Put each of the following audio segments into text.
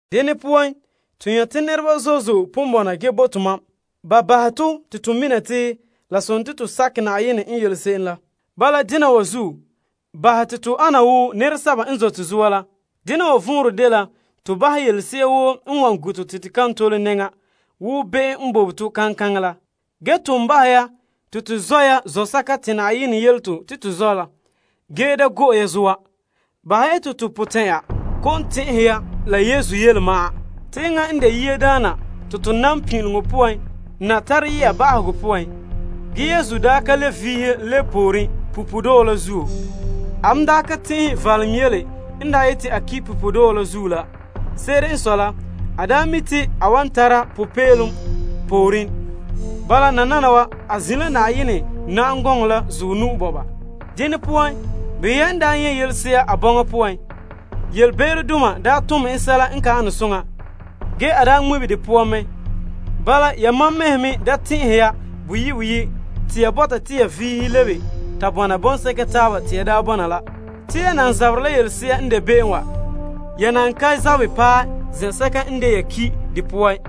Dene poan, to nyɛ' te nɛreba zo'e zo'e pon bɔna bahɛ te to mina te la sontii to nam Na'ayenɛ n yele se'em la. Bala dena wa zuo, bahɛ te to ana wo nɛreba n zote zoa la ge bahɛ yelese'a woo n wan gu' to la be'em n bobe to kaŋkaŋɛ la. Ge, ton bahɛ ya te to zɔ' ya to zɔsɛka te Na'ayenɛ yele to zɔ' la ge da go'e ya zoa. Bahɛ ya te to potɛn'ɛra kɔ'ɔn tɛn'ɛhe ya la Yesu yele ma'an. Enŋa n de se'em te to nam pin'ileŋɔ poan na tare yɛ'a ba'ahegɔ poan. A daa ka le vihe lebe pooren punpuuredɔɔ la zuo. A ka tɛn'ɛhe valom yele n daa ta yeti a ki' punpuuredɔɔ zuo la. Se'ere n sɔe la, a mi' te a wan ta tara popeelom pooren. Te nananawa a zin' la Na'ayenɛ na'am gɔŋɔ la zuɔ nu'o. Behɛ ya en daa nyɛ' yelese'a a bɔŋa poan, yelebe'erodoma n tom en sɛla n ka an soŋa, ge a daa ŋmibe de poan mɛ. Bala, yamam mɛhe da tɛn'ɛhe ya boyi' boyi' te ya bɔta te ya vihe lebe ta bɔna bɔŋsɛka taaba te ya daa bɔna la. Te yan nan zaberɛ la yelese'a n de be'em wa. Ya nan ka zabɛ paɛ zɛn'sɛka n de ya ki' de poan.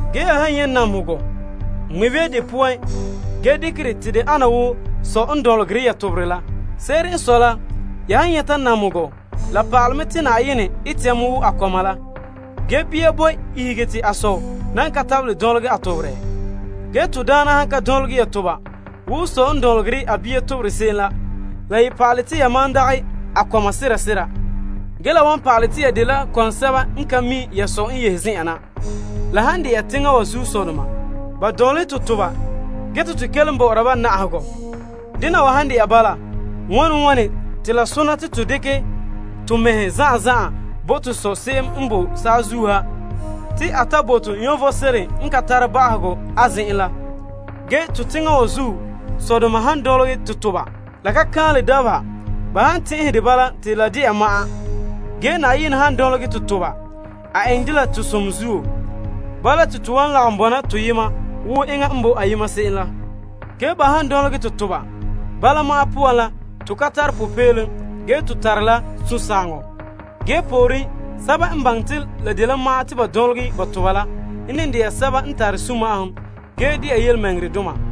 Ya han nyɛ' namehegɔ, ŋmibe ya de poan ge dekɛ dɛ te de ana wo sɔ n dɔnlegɛ ya toberɛ la. Se'ere n sɔe la, ya han nyɛta namehegɔ la pa'alɛ mɛ te Na'ayenɛ ete ya mɛ wo a kɔma la. Ge bia boe ihege te a sɔ nan ka tabelɛ dɔnlegɛ a toberɛ? Ge Na'ayenɛ han ka dɔnlegɛ ya toba wo sɔ n dɔnlehe a kɔma se'em la, la ye pa'alɛ te yamam dagɛ a kɔma sera sera ge ka mi' ya sɔ n yehe zen'en na. La han dɛna te teŋa wa sɔdoma, ba dɔnlehe to toba ge te to kelom bɔ'ɔra ba. Dena wa han de'a bala, wane wane te la sona te to dekɛ to mɛhe zan'an zan'an bo to Sɔ se'em n boe saazuo ha te a ta bo to vom sebo n ka tare ba'ahegɔ? Te to teŋa wa zuo sɔdoma n dɔnlehe to toba, la ka kan'anle dabeha ban tɛn'ɛhɛ de bala te de de'a ma'an. Ge Na'ayenɛ han dɔnlegɛ to toba, a eŋɛ dɛ la to som zuo, te to wan lagom tara a toolom bɔŋa la taaba la zuo. Ba han dɔnlegɛ to toba, bala ma'an poan la, to ka tare popeelom ge to tare la sunsagaŋɔ. Ge pooren, sɛba n baŋɛ te la de ma'an te ban dɔnlehɛ to toba n ne dela sɛba n tare sunma'ahom ge dɛna tontɔɔdoma.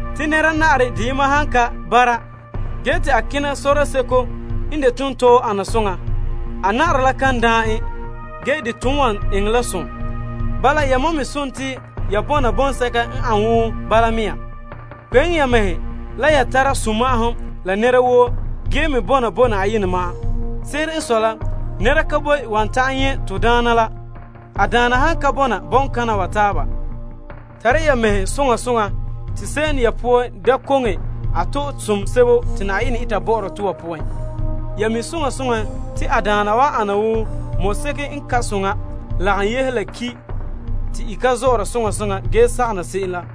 Te nɛra na'arɛ deyema han ka bara ge te a kena sɔrɔɔ seko n de tontɔɔ ana soŋa, a na'arɛ la kan daan en. Ge, de wan ton eŋɛ la som. Bala, yamam me sontii ya bɔna bɔŋsɛka n ane wo bala mea. Kpeŋe ya mɛhe la ya tara sunma'ahom la nɛra woo ge me bɔna bo Na'ayenɛ ma'an. Se'ere n sɔe la, nɛra han ka bɔna bo Na'ayenɛ ma'an wan ta'an nyɛ' en. Tara ya mɛhe soŋa soŋa te se'em ya poan koŋe a to'e som sebo te Na'ayenɛ eta bɔ'ɔra tɔ wa poan. Se'em ya poan han ka to'e som ge eŋɛ la saganɔ, enŋa daana wan ana wo mɔseko n ka soŋa lagom yehe la ki' te i ka zɔ'ɔra soŋa soŋa ge sagaŋɔ na se'em la.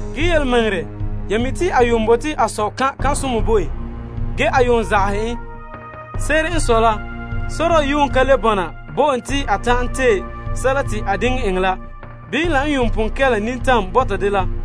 Ge yelemɛŋɛrɛ, ya mi' te a yuun bote a sɔ kan' kan'somɔ bo en. Ge, a yuun zagahɛ en. Se'ere n sɔe la, sɔrɔɔ ka le bɔna bo en te a ta'an tee sɛla te a diŋe enŋɛ la bii la n yuun pon kɛla la nintam bɔta dela.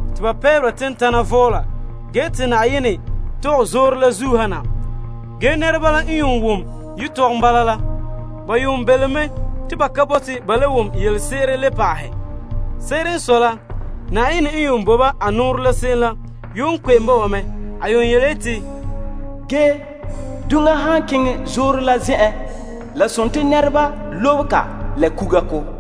te pɛɛbera tentana vɔɔla, te Na'ayenɛ tɔgɛ zoore la zuo ha na ge te nɛreba belom mɛ te ba ka bote ba le wom yelese'ere le pa'ahɛ. Se'ere n sɔe la, Na'ayenɛ n yuun bo ba a nɔɔrɛ la se'em la yuun kpe'em bo ba mɛ, yeti, Duŋa han kalom zoore la lobe ya en la kuga ko'.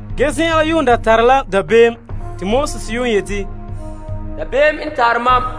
Ge zen'an la yuun da ba tara la dabeem te Moses yuun yeti, Te dabeem kɛn' mam.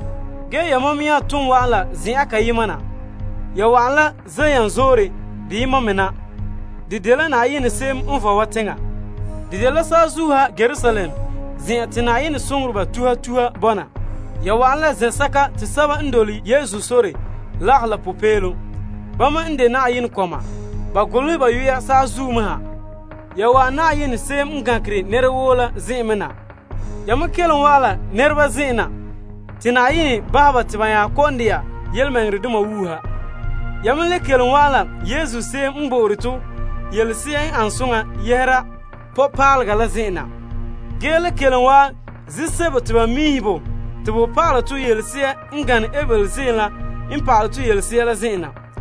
Ge, yamam nya ton wa'an la zen'an kayema na, Zion Zoore na. De dela Na'ayenɛ se'em n vɔe wa teŋa la saazuo ha Yerusalem zen'an la Na'ayenɛ soŋoreba tuha tuha bɔna la popeelom la na. Ya wa'an zɛn'sɛka te sɛba n dole Yesu sore lagahɛ na. Bama n de Na'ayenɛ kɔma la a golehɛ ba yu'ura saazuo me ha. Ya wa'an Na'ayenɛ se'em n gankere nɛra woo la zen'en me na la tontɔɔ nɛreba zen'en na te Na'ayenɛ bahɛ ba te ba nya kɔ'ɔn dɛna yelemɛŋɛrɛdoma wuuha. Ya me le kelom wa'an la Yesu se'em n bo'ore to nɔbiŋpaalega la zen'en na, ge le kelom wa'an ziim sebo te ba miihe bo te bo pa'ala tɔ yelese'a n gana Abel kaanbegɔ ziim la n pa'alɛ tɔ yelese'a.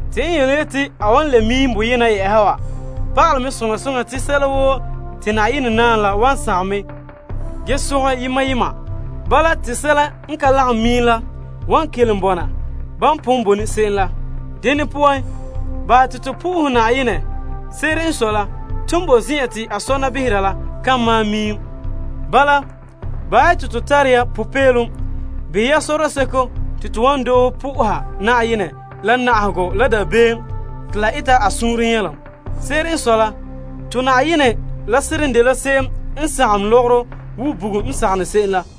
Te en yeti ge lagom miim wa pa'alɛ mɛ soŋa soŋa te sɛla woo te Na'ayenɛ naam la wan sagom mɛ ge zongɛ yema yema. Bala, te sɛla n ka lagom miim la wan kelom bɔna ban pon bone se'em la. Dene poan, bahɛ te to bo Na'ayenɛ fara. Se'ere n sɔe la, ton boe zen'en te a sɔna behere la kan malom miim. Bala, bahɛ te to tare ya popeelom behɛ ya sɔrɔɔ seko te to wan doohe po'oha Na'ayenɛ la, na'ahegɔ la dabeem te la eta a suunre nyɛlom. Se'ere n sɔe la, to Na'ayenɛ la seren dela se'em n sagom lɔgɔrɔ wo bugum n sagom se'em la.